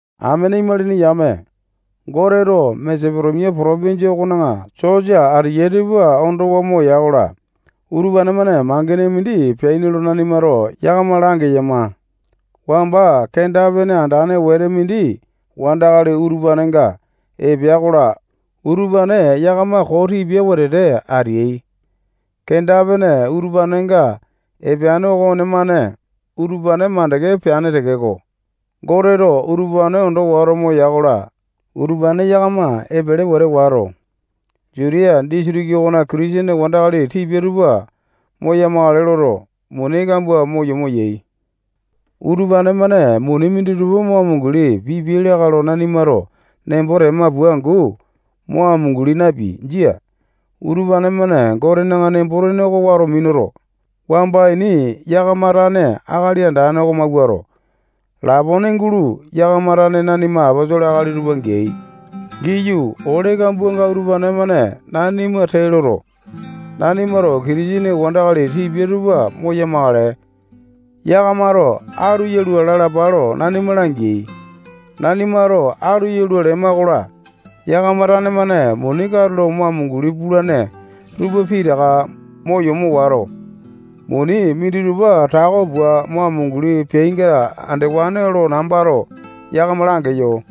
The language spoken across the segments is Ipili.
Amene imalini yame, Goteto Masetonia potopinjia okona sosa ateyai tupa ondowa moya-kola, utupane-mane mangene mindi peaini lo nanimato yakama langeyama. Wamba kenda-pene andane wete mindi wandakali utupanenga epea-kola, utupane yakama koo tipia wetete ateai. Kenda-pene utupanenga epeane okonemane utupane mandeke peane tekeko, Goteto utupane ondo wato moya-kola, utupane yakama epele wete wato, Jutiya disitiki okona Kitisene wandakali tipia tupa moya-makale loto, muni kambua mo yomo yai. Utupane-mane muni minditupa mo amunguli pipiai lakae lo nanimato nembo tema pua angu mo amunguli napeai. Jia. Utupane-mane Gotena nembo-tene oko wato minuto, wamba ini yakama tane Akali Andane oko mawuato, lapone gulo yakama tane nanima aposolo akali tupa geai. Giyu, ole kambuanga utupane-mane nanima tee loto, nanimato Kitisene wandakali tipia tupa moya-makale. Yakamato atu yalua lalapa lo nanima langeai. Nanimato atu yalua lema-kola, yakama tane-mane muni katulo mo amunguli pulane tupa pitaka mo yomo wato, muni minditupa tako pua mo amunguli peainga andewane lo nambato yakama langeyo.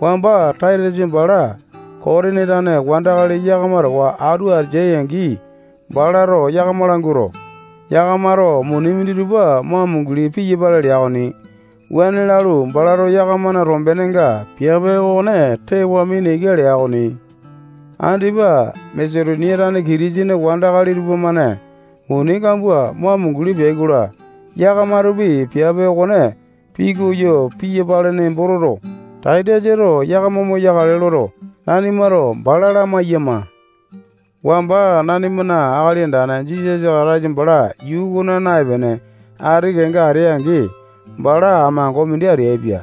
Wamba Taitasa bala Kotini tane wandakali yakama towa atu ateai-angi, balato yakama languato, yakamato muni minditupa mo amunguli piyapale lea okoni. Wuane lalu, balato yakamana tombenenga piape okone tewa mina ika lea okoni. Andipa Masetonia tane Kitisene wandakali tupamane muni kambua mo amunguli peai-kola, yakamatopi piape okone pikoyo piyapale nembo toto, Taitasato yakama moyakale loto, nanimato bala lamaiyama. Wamba nanimana Akali Andane Jisasa Kataisa bala yuu okona naepene, ati kenga atea-angi, bala amango mindi ateaipia.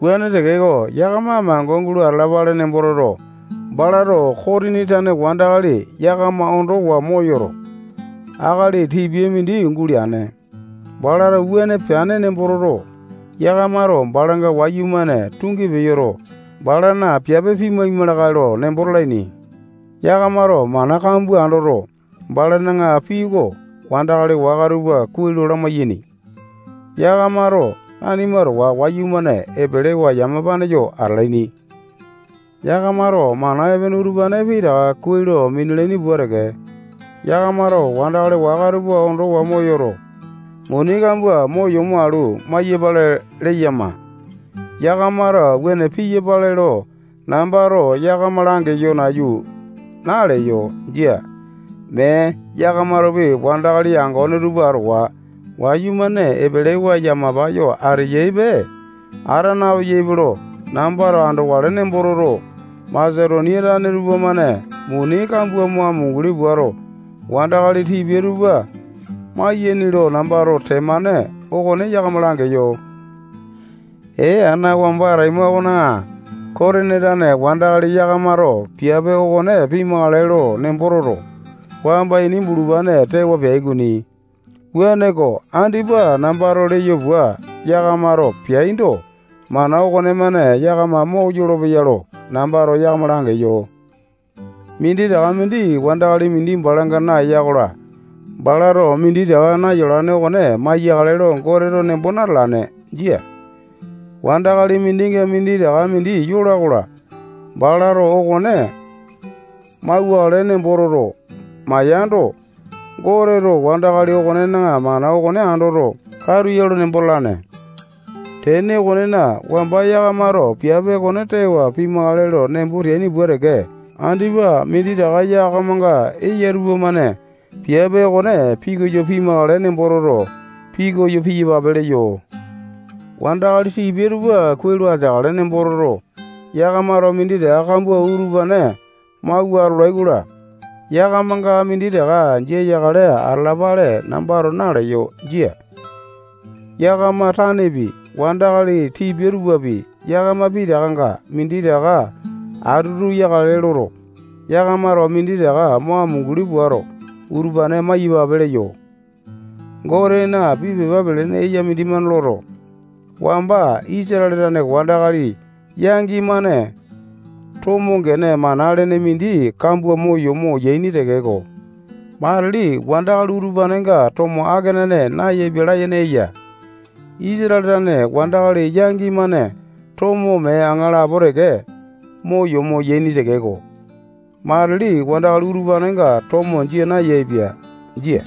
Wuane tekeko, yakama amango gulo atalapale nembo toto, balato Kotini tane wandakali yakama ondowa moyoto, akali tipia mindi guleane. Balato wuane peane nembo toto, yakamato balanga wayumane tungi peyoto, balana piape pima lakae lo nembo talaini. Yakamato mana kambua andoto, balana pii oko wandakali waka tupa kuai lo lamai-yaini. Yakamato nanima towa wayumane epelewa yamapane yo atalaini. Yakamato mana epene utupane pitaka kuai lo minalaini pua teke, yakamato wandakali waka tupa ondowa moyoto, muni kambua mo yomo alu, mai-yapale leyama. Yakamato wuane piyapale lo, nambato yakama langeyo nayu naleyo. Jia. Mee, yakamatopi wandakali yangone tupa towa wayumane epelewa yamapa yo ateyaipe, ata napeyaipe lo, nambato andokale nembo toto, Masetonia tane tupamane muni kambua mo amunguli puato, wandakali tipia tupa mayaini lo nambato temane okone yakama langeyo. Ee ana wamba ataima okona Kotini tane wandakali yakamato piape okone pima lakae lo nembo toto, wamba ini bulupane tewa peai okoni. Wuaneko, andipa nambato leyo pua yakamato peaindo, mana okonemane yakama moyolo-peya lo nambato yakama langeyo. Minditaka mindi wandakali mindi balanga nayola-kola, balato minditaka nayolane okone maiyakale lo Goteto nembo natalane. Jia. Wandakali mindinga minditaka mindi yola-kola, balato okone mauwakale nembo toto, maiyando, Goteto wandakali okonena mana okone andoto, katu ya lo nembo talane. Tene okonena, wamba yakamato piape okone tewa pima lakae lo nembo teaini pua teke, andipa minditaka yakamanga eya tupamane piape okone pikoyo pimakale nembo toto, pikoyo piyapape leyo. Wandakali tipia tupa kuai lo ateakale nembo toto, yakamato minditaka kambua utupane mawua atolai-kola, yakamanga minditaka jia yakale atalapale nambato naleyo. Jia. Yakama tanepi, wandakali tipia tupapi, yakama pitakanga minditaka atutu yakale loto, yakamato minditaka mo amunguli puato, utupane maiyapape leyo. Gotena pii pepa pelene eya mindimane loto, wamba Isatale tane wandakali yangi-mane tomo gene mana lene mindi kambua mo yomo yaini tekeko, matili wandakali utupanenga tomo akenane nayaepia layene eya. Isatale tane wandakali yangi-mane tomo mee aŋalapo teke mo yomo yaini tekeko, matili wandakali utupanenga tomo jia nayaepia. Jia.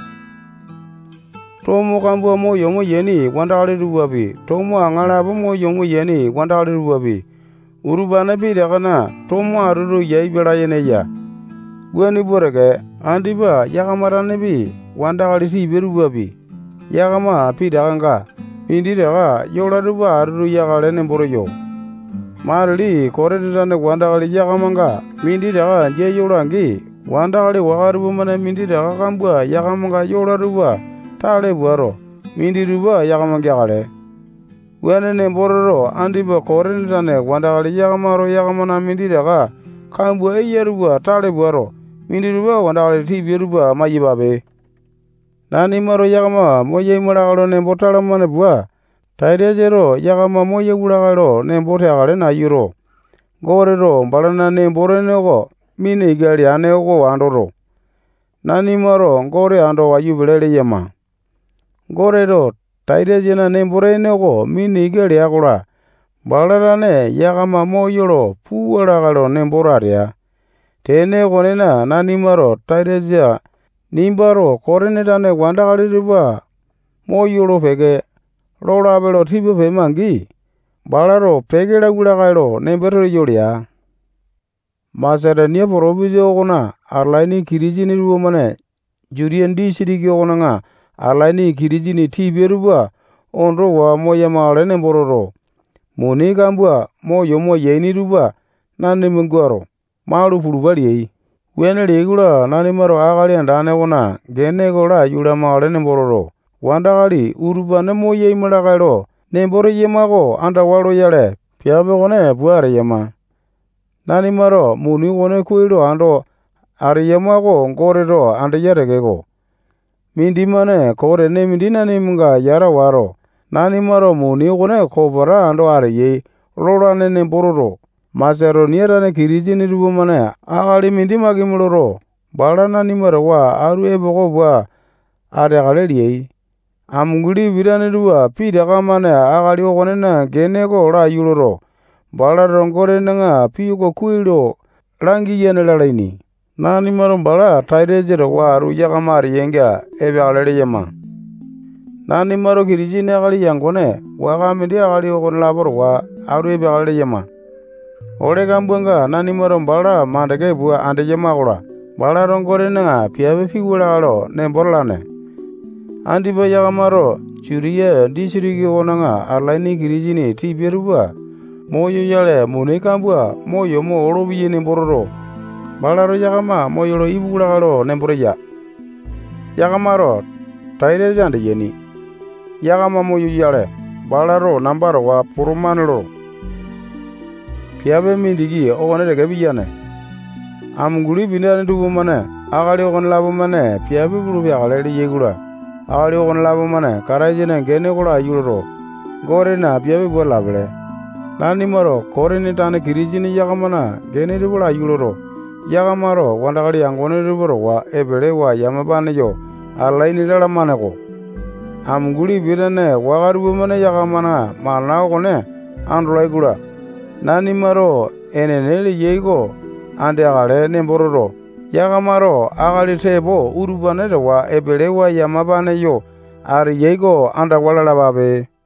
Tomo kambua mo yomo yaini wandakali tupapi, tomo aŋalapo mo yomo yaini wandakali tupapi, utupane pitakana tomo atutu yaepia layene eya. Wuane pua teke, andipa yakama tanepi, wandakali tipia tupapi, yakama pitakanga minditaka yola tupa atutu yakale nembo teyo. Matili Kotini tane wandakali yakamanga minditaka jia yola-angi, wandakali waka tupamane minditaka kambua yakamanga yola tupa tale puato, minditupa yakama geakale. Wuane nembo toto, andipa Kotini tane wandakali yakamato yakamana minditaka kambua eyai tupa tale puato, minditupa wandakali tipia tupa maiyapape. Nanimato yakama moyaima lakae lo nembo talamane pua, Taitasato yakama moyauwa lakae lo nembo teakale nayuto, Goteto balana nembo-tene oko mina ika leane oko andoto, nanimato Gote ando wayu pele leyama. Goteto Taitasana nembo-tene oko mina ika lea-kola, bala tane yakama moyolo puwa lakae lo nemboto atea. Tene okonena, nanimato Taitasa nimbato Kotini tane wandakali tupa moyolo peke lolape lo tipa pema-angi, balato peke lauwa lakae lo nembo teyo lea. Masetonia potopinjia okona atalaini Kitisene tupamane Jutiya disitiki okona atalaini Kitisene tipia tupa ondowa moya-makale nembo toto, muni kambua mo yomo yaini tupa nanima guato, malu pulupape leai. Wuane leai-kola, nanimato Akali Andane okona gene oko laiyu lamakale nembo toto, wandakali utupane moyaima lakae lo nembo teyama oko andawa loyale, piape okone pua ateyama. Nanimato muni okone kuai lo ando ateyama oko Goteto andeya tekeko, mindimane koo tene mindi nanimanga yata wato, nanimato muni okone kopeta ando ateyai lolane nembo toto, Masetonia tane Kitisene tupamane akali mindi makimi loto, bala nanima towa atu epoko pua ateakale leai. Amunguli pitane tupa pitaka-mane akali okonena gene oko laiyu loto, balato Gotena pii oko kuai lo langiyane lalaini. Nanimato bala Taitasa towa atu yakama ateyainga epeakale leyama. Nanimato Kitisene akali yangone waka mindi akali okonelapo towa atu epeakale leyama. Ole kambuanga nanimato bala makande pua andeyama-kola, balato Gotena piape piwua lakae lo nembo talane. Andipa yakamato Jutiya disitiki okona atalaini Kitisene tipia tupa moyoyale muni kambua mo yomo olopeyai nembo toto, balato yakama moyolo ipuwa lakae lo nembo teya. Yakamato Taitasa andeyaini. Yakama moyoyale, balato namba towa potomane loto, piape mindiki okone teke piyane. Amunguli pitane tupamane akali okonelapo piape pulu peakale leai-kola, akali okonelapo-mane Kataisana gene oko laiyu loto, Gotena piape pua atalapele. Nanimato Kotini tane Kitisene yakamana gene tupa laiyu loto, yakamato wandakali yangone tupa towa epelewa yamapane yo atalaini lalamane-ko. Amunguli pitane waka tupamane yakamana mana okone andolai-kola, nanimato enene leyai oko andeakale nembo toto, yakamato akali tepo utupane towa epelewa yamapane yo ateyai oko andawa lalapape.